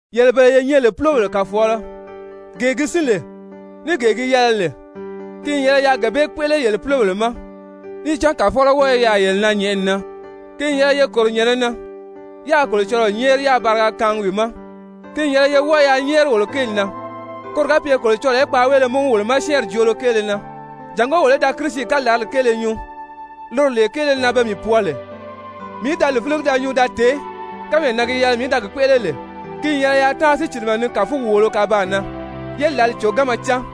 Yele bele ye nyɛ lè púlobèle kàfɔɔlɔ, gee gi sín lè ní gee gi yɛlɛ lè, ki n yɛlɛ yaa gee bee kpéʔele yele púlobèle ma, níì cán Kàfɔlɔ wɔ́ɔ i yaà yele na nyɛ̀ʔɛni na. Ki n yɛlɛ ye kòro nyɛ̀nɛ na yaa Kolocɔlɔɔ nyɛ́ɛri yáā bariga kaangi wi ma. Ki n yɛlɛ ye wɔ́ɔ yaa nyɛ́ɛri wolo kéeli na, koro ga pye Kolocɔlɔɔ í kpàánweele múgu wolo ma syɛ́ɛnri joolo kéele na, jàngó wolo í da Kirisi kalarali kéele nyuu, loro lee kéele na pe mii pwɔɔ lè, mii í da li fíligi da nyuu da tèé kánmee na gi yɛlɛ mii í da gi kpéʔele lè. Ki n yɛlɛ yaa táanri sícilimɛ ni kàfugi wòolo kabaan na, yé lǎli còganma cán.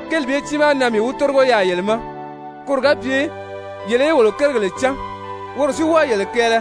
Kéeli bee tiimaa na mii wi tórigo yaà yele ma, koro ga pye yele í wolo kérigèle cán, woro si wɔ́ɔ yele kɛɛlɛ.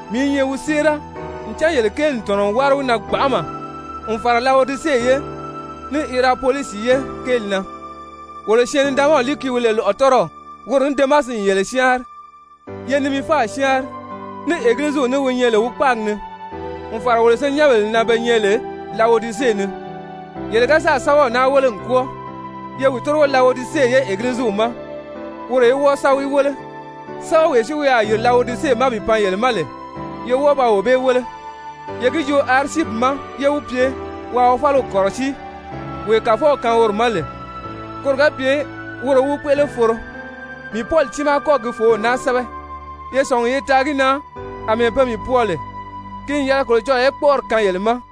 Mii i nyɛ wi séera ncan yele kéeli n tɔ̀nɔ n wári wi na gbanʔama n fàra Lawodise ye, ní Hirapolisi ye kéeli na. Wolo syɛɛn-nidaanmaw Luki wi nyɛ lè lɔ̀ʔɔtɔrɔw, woro ní Demasi n yele syáanri. Ye Nimifa syáanri ní Egiliziw ní wi nyɛ lè wi kpáagi ni, n fàra wolo senyɛnbèle na be nyɛ lè Lawodise ni. Yele ga sáà sɛ́bɛw naa wéle n kwɔ́ɔ, ye wi tórigo Lawodise ye Egiliziw ma woro í wɔ́ɔ sa wi wéle, sɛ́bɛwee si wi a yìri Lawodise ma bi pan yele ma lè, ye wɔ́ɔ ba wee bee wéle. Ye gi joo Arisyipi ma yé wi pye waa wi fáliw kɔ̀rɔsíi wee Kàfɔw kaan woro ma lè, koro ga pye woro í wi kpéʔele foro. Mii Pɔli tiimaa kɔ́gi gi fòów naa sɛ́bɛ. Ye sɔ̀ngi ye taa gi na àmɛɛ pe mii pwɔɔ lè. Ki n yɛlɛ Kolocɔlɔɔ í kpɔ́ʔɔri kaan yele ma!